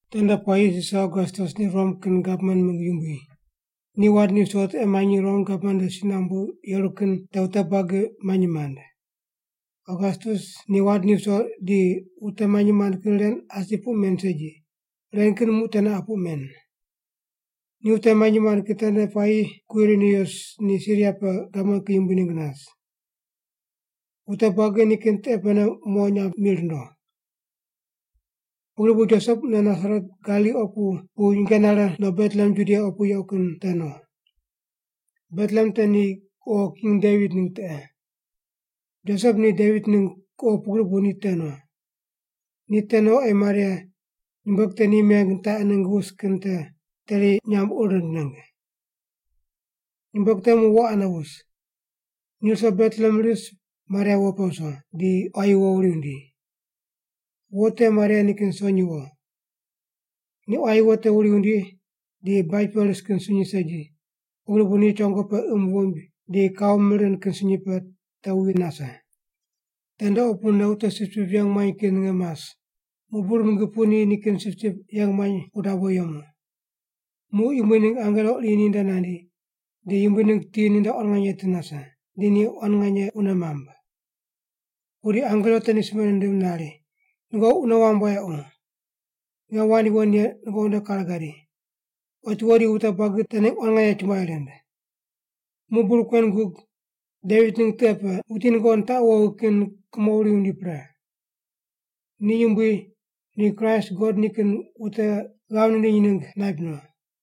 Tende puayi Sisar Ogastus ni Rom kin gavman mingg yumbui. Ni wand ni viso tiqe manyi Rom gavman nde si nambu yeru kin te wute buagi manyi mand. Ogastus ni wand ni viso di wute manyi mand kin ren asi puq men segi, ren kin muq teneqa puq men. Ni wute manyi mand kin tende puayi Kwirinius ni Siria pe gavman kin yumbui ningg nas. Wute buagi nikin tiqe pene mo nyamb mi rundo. Pugri bu Josep mune Nasaret Galili opu pu nyinge nare no Betlehem Judia opu yequ kin te no. Betlehem te ni kuqo king Devit ningg tiqe. Josep ni Devit ningg kuqo pugri bu ni te no. Ni te no ei Maria, nyumbueg te ni meng nitaqi ningg wus kin te, teri nyamb ur rind ningg. Nyumbueg te muq wo ane wus. Ni ruso Betlehem ris Maria wo pe wuso, di quayi wo wuri wundi. Wo te Maria nikin sonyi wo. Ni quayi wo te wuri wundi di baj pe ris kin sunyi segi, pugri bu ni chongo pe imb wuimb di kau mir rind kin sunyi pe te wuwi nase. Tende opune wute sipsip yeng muany kin ninge mas, muq bur mingi pu ni nikin sipsip yeng muany pu dabo yemu. Muq Yumbui ningg angelo iri ni nde nandi, di Yumbui ningg ti ninde quan nganye ti nase, di ni quan nganye wune mamb. Pudi angelo te ni simbe nindim nari, “Nungoqi wune wamb wayequ. Nge wand yuwon ye nungoqi nde kare gadi. Otiwo di wute buagi te ningg quan nganye chumbuai rind. Muq bur kuen gug, Devit ningg tiqe pe, wuti nungoqi nitaqu wowi kin kumo wuri wundi pre. Ni Yumbui, ni Kraist God nikin wute ghav nindiny ningg naip no!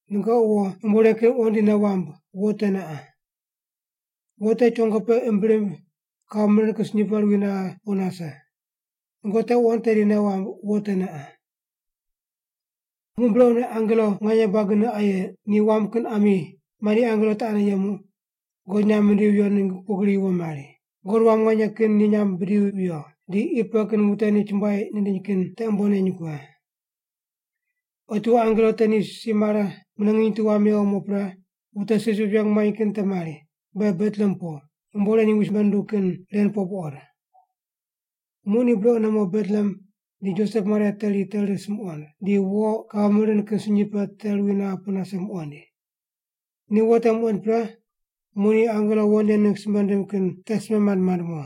Nungoqi wo yumbo ren kin wuqond di nei wamb wo teneqa: Wo te chongo pe imb rimb kau mir rind kin sunyi pe ruwi naghe pu nase. Nungoqi te wuqond tedi nei wamb wo teneqa.” Muq brequne angelo nganye buagine aye, ni wam kin ami, mandi angelo te ane yemu, God nyamb mindivi viyo ningg pugri yuwo mari: “God wam nganye kin ni nyamb bidivi viyo, di qi pe kin wute ni chumbuai nindiny kin te umbo neny kughe.” Otiwo angelo te ni si mare mune nginy tu wam mewo mo pre, wute sipsip yeng muany kin te mari, “Be Betlehem po, yumbo ren Yumbui simbe nundug kin ren po buqod.” Muq ni brequne mo Betlehem di Josep Maria teri te ris muqond, di wo kau mir rind kin sunyi pe te ruwi naghe pu nase muqoind. Ni wo te muqoind pre, muq ni angelo wo nen ningg simbe nindim kin te simbe mand mand mo.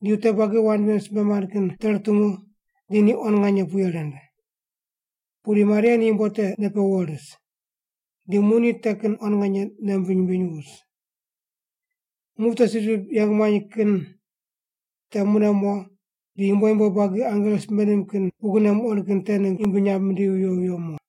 Di wute buagi wand ven simbe mand kin te rutungu di ni quan nganye puye rind. Pudi Maria ni yumbo te nei pe wuwo ris. Di muq ni te kin quan nganye nei wumbiny wumbiny wus. Muq wute sipsip yeng muany kin te mune mo, di yumbo yumbo buagi angelo simbe nindim kin pugrine muqond kin te ningg Yumbui nyamb mindivi viyo viyo mo.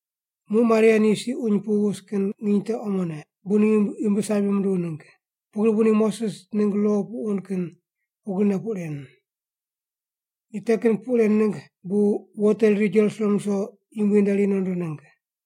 Muq Maria ni si uny pu wus kin nginy te omone, bu ni ghimbi sabi munduw ningg. Pugri bu ni Moses ningg lo puq wund kin pugrine puq ren. Ni te kin puq ren ningg bu wo te riri Jerusalem ruso Yumbui nde ri nondo ningg.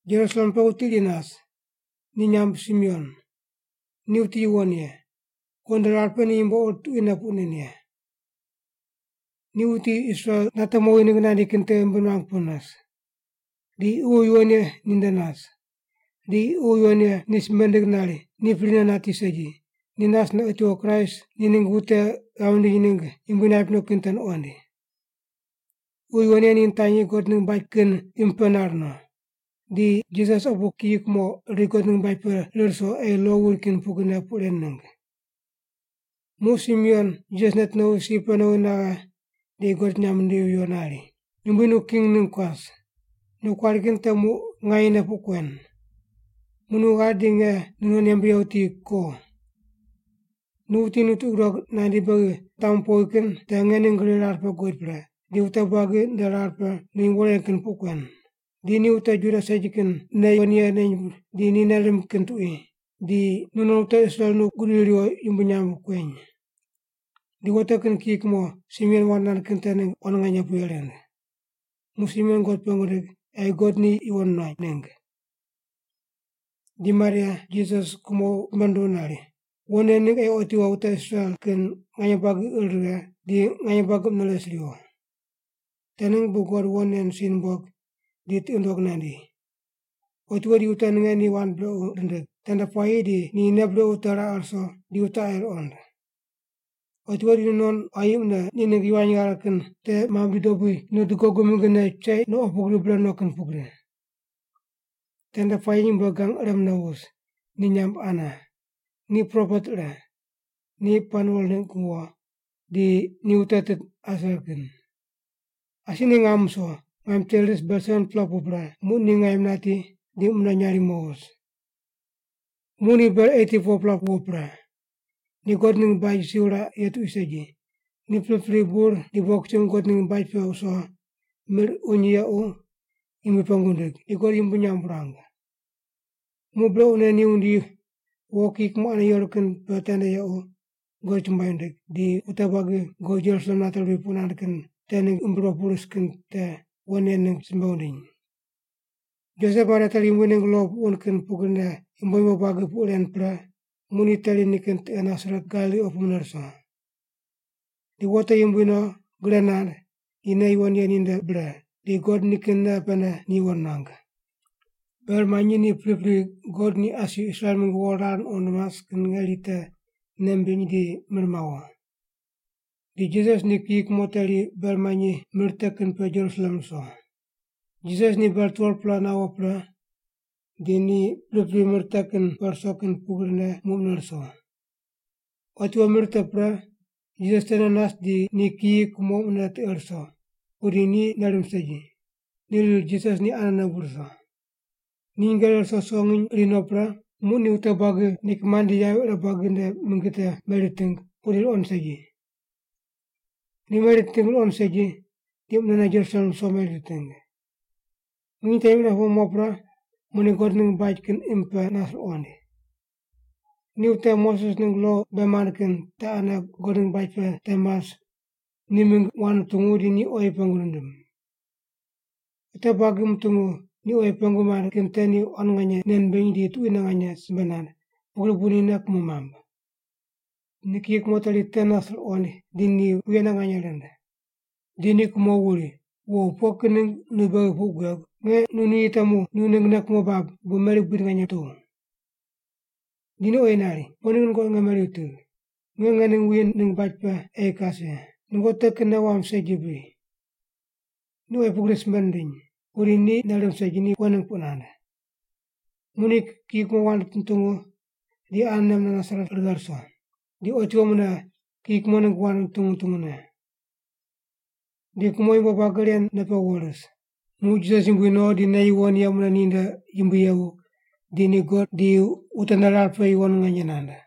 Jerusalem pe wuti iri nas, ni nyamb Simeon. Ni wuti yuwon ye. God nde rar pe ni yumbo ur tuquine puq nen ye. Ni wuti Israel nate mowi ningg nandi kin te ghimbi nuang pu nas. Di Ququ Yuwon Ye ni nde nas, di Ququ Yuwon Ye ni simbe nindig nari ni prine nati segi, ni nasne otiwo Kraist ni ningg wute ghav nindim ningg Yumbui naip no kin te nuqoind. Ququ Yuwon Ye ni nitanyi God ningg baj kin imb pe nar no. Di Jisas opu kiyi kumo riri God ningg baj pe rir ruso ei lo wuri kin pugrine puq ren ningg. Muq Simeon Jisas neti nowi si pe nowi naghe di God nyamb nindivi viyo nari, “Yumbui nu king ningg kuas. Nu kuari kin te muq nganyene puq kuen. Muq nu ghari di nge nu non yembe ye wuti ko. Nu wuti nu tiqi gudog nandi beghi nitamu powi kin te nge ning gri rar pe guqod pre, di wute buagi nde rar pe nu yumbo ren puq kuen; di ni wute Juda segi kin nei yuwon ye neny di ni nei rimb kin tuqui, di nu non wute Israel nu gudiri riwo yumbui nyamb kueny.” Di wo te kin kiyi kumo Simeon wand nand kin te ningg quan nganye puye rind. Muq Simeon God pengu nindig ei God ni yuwon nuany ningg. Di Maria, Jisas kumo simbe nunduw nari, “Wo nen ningg ei otiwo wute Israel kin nganye buagi ir righe, di nganye buagi mune res riwo. Te ningg bu God wo nen si numbog di tiqi nundog nandi. Otiwo di wute ninge ni wand brequ rindig, tende puayi di ni nei brequ te raqe ruso di wute aye ruqond. Otiwo di nu non quayi mune ni ningg yivany ghare kin te mame bidi dobui nu dugogu mingine cheiq no opu gri bre no kin pugri.” Tende puayi nyumbueg gang ire mune wus, ni nyamb Ana. Ni propet ire. Ni Panuel ningg wo, di ni wute tit Aser kin. Asi ni ngam wuso, ngaim teri ris ber 7-pela pu pre, muq ni ngaim nati di mune nyarimo wus. Muq ni ber 84-pela wuwo pre. Ni God ningg baj si wuraq ye tuqui segi, ni pripri bur di bogisumb God ningg baj pe wuso, mir uny yequ Yumbui pengu wundig, di God yumbui nyamb wurang. Muq brequne ni wundi wo kiyi kumo ane yeru kin pe tende yequ, God chumbuai wundig, di wute buagi God Jerusalem nate ruwi puq nand kin te ningg ghimbi ruwo pu ris kin te, wo nen ningg simbe wundiny. Josep Maria teri Yumbui ningg lo puq wund kin pugrine yumbo yumbo buagi puq ren pre, muq ni teri nikin tiqe Nasaret Galili opu mune ruso. Di wo te yumbui no, gre nand, di nei yuwon ye ni nde bre, di God nikin nei pene ni yuwon nuang. Ber manyi ni pripri God ni asi Israel mingg wo rar nuqond mas kin ngeri te nei mimbiny di mir mawo. Di Jisas ni kiyi kumo teri ber manyi mir te kin pe Jerusalem ruso. Jisas ni ber 12-pela nawo pre, di ni pripri mir te kin pe ruso kin pugrine muq mune ruso. Otiwo mir te pre, Jisas tene nas di ni kiyi kumo mune tiqe ruso, pudi ni nei rimb segi, ni riri Jisas ni anene bu ruso. Ni nyinge rire ruso ruso nginy iri no pre, muq ni wute buagi ni kimand di yavi ire buagi nde mingi te meri riting, pudi ruqoind segi. Ni meri riting ruqoind segi, di munene Jerusalem ruso meri riting. Nginy temi ire pu mo pre muq ni God ningg baj kin imb pe nas ruqoind. Ni wute Moses ningg lo bei mand kin te ane God ningg baj pe te mas ni mingg wand nutungu di ni oyi pengu nindim. Wute buagi mutungu ni oyi pengu mand kin te ni quan nganye nei nimbiny di tuquine nganye simbe nand, pugri bu ni nei kumo mamb. Ni kiyi kumo teri te nas ruqoind di ni puyene nganye rind. Di ni kumo wuri, “Wo, pughe kin ningg nu beghi puq guegu? Nge nu nuyi temu nu ningg nei kumo bab, bu meri buid nganye putuw.” Di ni oyi nari, “Pughe ningg nungoqi nge meri wutigh? Nge ngening wuyi ningg baj pe ei kas ye, nungoqi te kin nei wamb segi bri?” Ni oyi pugri simbe nindiny, pudi ni nei rimb segi ni pughe ningg puq nand. Muq ni kiyi kumo wand nutungu di anene mune Nasaret righe ruso, di otiwo mune kiyi kumo ningg wand nutungu nutungu ne. Di kumo yumbo buagi ren nei pe wuwo ris. Muq Jisas yumbui no di nei yuwon ye mune ni nde yumbui yevu, di ni God di wute nde rar pe yuwon nganye nand.